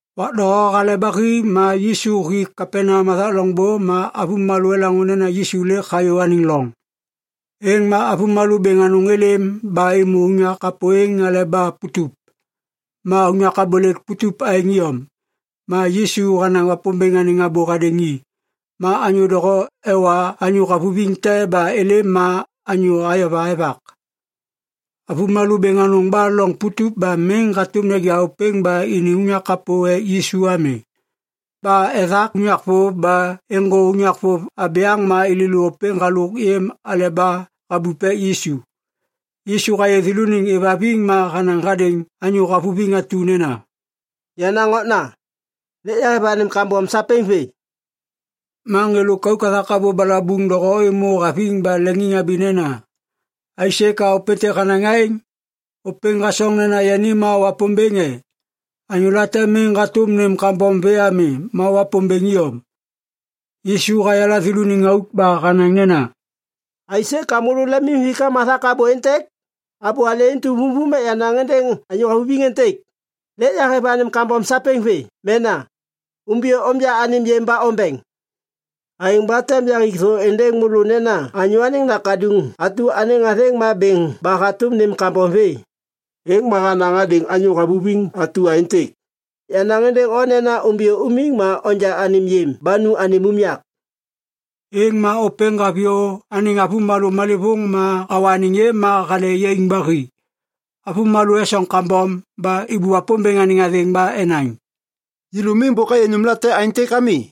Wak doho hale ba hi ma Yisu hi Kapaneam hathak loŋbô ma avômalô elaŋô nena Yisu lêk hayô anêŋ loŋ. Êŋ ma avômalô bêŋ anôŋ êlêm ba êmô unyak kapô êŋ aleba putup, ma unyak abôlêk putup aêŋ iyom. Ma Yisu hanaŋ Wapômbêŋ anêŋ abô hadêŋ i. Ma anyô doho ewa anyô havuviŋ te ba êlêm ma anyô ayova evak. Avômalô bêŋ anôŋ ba loŋ putup ba miŋ hatôm neja ôpêŋ ba ini unyak kapô ek Yisu ami. Ba ethak unyak vôv ba êŋgô unyak vôv abyaŋ ma êlêlô ôpêŋ halôk yêm aleba habup ek Yisu. Yisu hayê thêlôniŋ êvhaviŋ, ma hanaŋ hadêŋ anyô havuviŋ atu nena, “Yenaŋ okna, lêk yahêv anêm kambom sapêŋ vê.” Ma ŋê lôkauk hathak abô balabuŋ doho êmô haviŋ ba leŋiŋhabi nena, “Aisê ka ôpêntêk hanaŋ aêŋ? Ôpêŋ hasoŋ nena yani ma Wapômbêŋ e? Anyô late miŋ hatôm nêm kambom vê ami ma Wapômbêŋ iyom.” Yisu hayala thêlôniŋ auk ba hanaŋ nena, “Aisê ka môlô lemimhikam hathak abô êntêk? Abô alê intu vumvum ek yanaŋ êndêŋ anyô havuviŋ êntêk: ‘Lêk yahêv anêm kambom sapêŋ vê’ mena ‘Umbiyô onja anêm yêm ba ombeŋ.’ Aêŋ ba tem yaŋgik thô êndêŋ môlô nena Anyô Anêŋ Nakaduŋ atu anêŋ athêŋ ma bêŋ ba hatôm nêm kambom vê.” Êŋ ma hanaŋ hadêŋ anyô havuviŋ atu aêntêk, “Yanaŋ êndêŋ o nena umbiyô umiŋ ma onja anêm yêm ba nu anêm unyak.” Êŋ ma ôpêŋ haviyô anêŋ avômalô malêvôŋ ma hawa anêŋ yêm ma hale yaiŋ ba hi. Avômalô esoŋ kambom ba êbô Wapômbêŋ anêŋ athêŋ ba enaŋ, “Yêlô miŋ bôk ayê nômlate aêntêk ami!”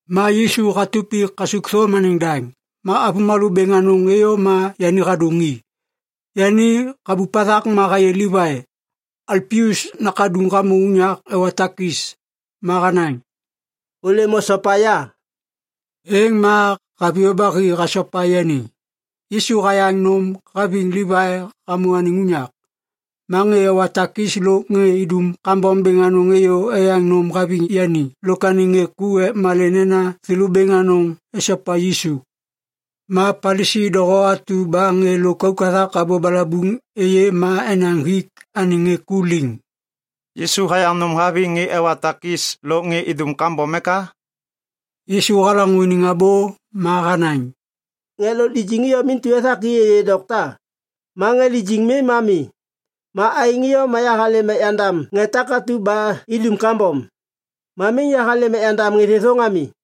Ma Yisu hatup hi kasukthôm anêŋ daŋ. Ma avômalô bêŋ anôŋ êyô ma yani hadôŋ i. Yani habup hathak ma hayê Livai, Alpius nakaduŋ hamô unyak ewa takis. Ma hanaŋ, “Ôlêm osopa ya.” Êŋ ma haviyô ba hi hasopa yani. Yisu hayaŋ nôm haviŋ Livai hamô anêŋ unyak. Ma ŋê ewa takis lôk ŋê idum kambom bêŋ anôŋ êyô eyaŋ nôm haviŋ yani lôk anêŋ ŋê ku ek malê nena thêlô bêŋ anôŋ esopa Yisu. Ma Palisi doho atu ba ŋê lôkauk hathak abô balabuŋ êyê ma enaŋ hik anêŋ ŋê ku liŋ, “Yisu hayaŋ nôm haviŋ ŋê ewa takis lôk ŋê idum kambom eka?” Yisu halaŋô iniŋ abô ma hanaŋ, “Ŋê lôk lijiŋ iyom intu ethak i êyê dokta. Ma ŋê lijiŋ mi ma mi. Ma aêŋ iyom yahalêm ek yandam ŋê takatu ba idum kambom. Ma miŋ yahalêm ek yandam ŋê thêthôŋ ami.”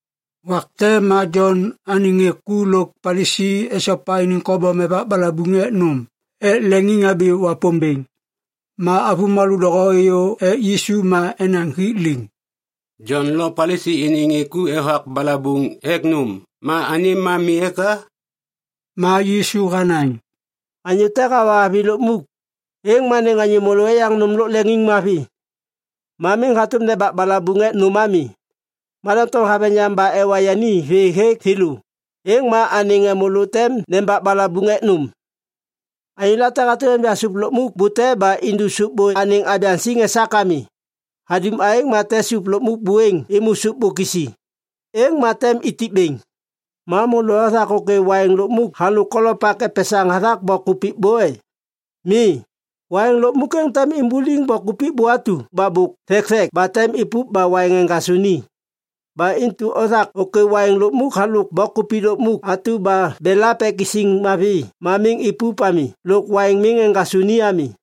Wak te ma Jon anêŋ ŋê ku lôk Palisi esopa iniŋ kobom evak balabuŋ ek nôm ek leŋiŋhabi Wapômbêŋ. Ma avômalô doho êyô ek Yisu ma enaŋ hik liŋ, “Jon lo Palisi iniŋ ŋê ku evak balabuŋ ek nôm ma anêm ma mi eka?” Ma Yisu hanaŋ, “Anyô te hawa avi lukmuk, êŋ ma anêŋ anyô môlô eyaŋ nôm lôk leŋiŋmavi. Ma miŋ hatôm nembak balabuŋ ek nôm ami. Ma doŋtom haveŋ yam, ba ewa yani vê hêk thêlô, êŋ ma anêŋ ŋê môlô tem nembak balabuŋ ek nôm. “Anyô late hatôm enja sôp lukmuk bute ba indu sôp bô anêŋ abyaŋ siŋ esak ami. Hadum aêŋ ma tem sôp lukmuk buêŋ êmô sôp bô kisi. Êŋ ma tem itip bêŋ. Ma môlô othak ôkê waiŋ lukmuk halôk kolopak epesaŋ hathak bok kupik bô e? Mi! Waiŋ lukmuk êŋ tem imbuliŋ bok kupik bô atu ba bôk thekthek ba tem ipup ba waiŋ eŋgasô ni. Ba intu othak ôkê waiŋ lukmuk halôk bok kupik lukmuk atu ba belap ek isiŋ mavi ma miŋ ipup ami lôk waiŋ miŋ eŋgasô ni ami.”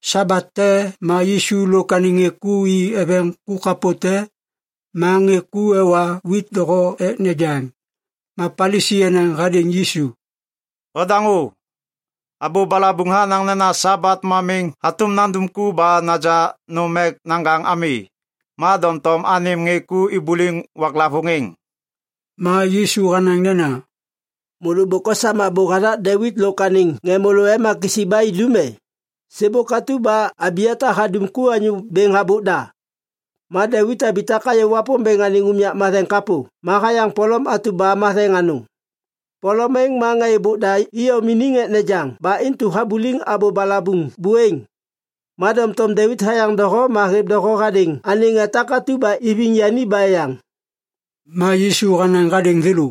Sabat te ma Yisu lôk anêŋ ŋê ku i eveŋ ku kapô te, ma ŋê ku ewa wit doho ek nejaŋ. Ma Palisi enaŋ hadêŋ Yisu, “Ondaŋô! Abô balabuŋ hanaŋ nena Sabat ma miŋ hatôm nandum ku ba naja nôm ek naŋgaŋ ami. Ma doŋtom anêm ŋê ku ibuliŋ waklavôŋ êŋ!” Ma Yisu hanaŋ nena, “Môlô bôk osam abô hathak Devit lôk anêŋ ŋê môlô ema kisi ba idum e? Sêbôk atu ba Abiata hadum ku anyô bêŋ habôk da, ma Devit habitak hayô Wapômbêŋ anêŋ unyak matheŋ kapô ma hayaŋ polom atu ba matheŋ anôŋ. Polom êŋ ma ŋê êbôk da iyom iniŋ ek nejaŋ ba intu habuliŋ abô balabuŋ buêŋ. Ma doŋtom Devit hayaŋ doho ma hêv doho hadêŋ anêŋ ŋê takatu ba iviŋ yani ba eyaŋ.” Ma Yisu hanaŋ hadêŋ thêlô,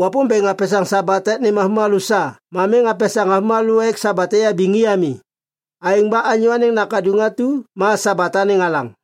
“Wapômbêŋ hapesaŋ Sabat ek nêm avômalô sa ma miŋ hapesaŋ avômalô ek Sabat eyabiŋ i ami. Aêŋ ba Anyô Anêŋ Nakaduŋ atu ma Sabat anêŋ Alaŋ.”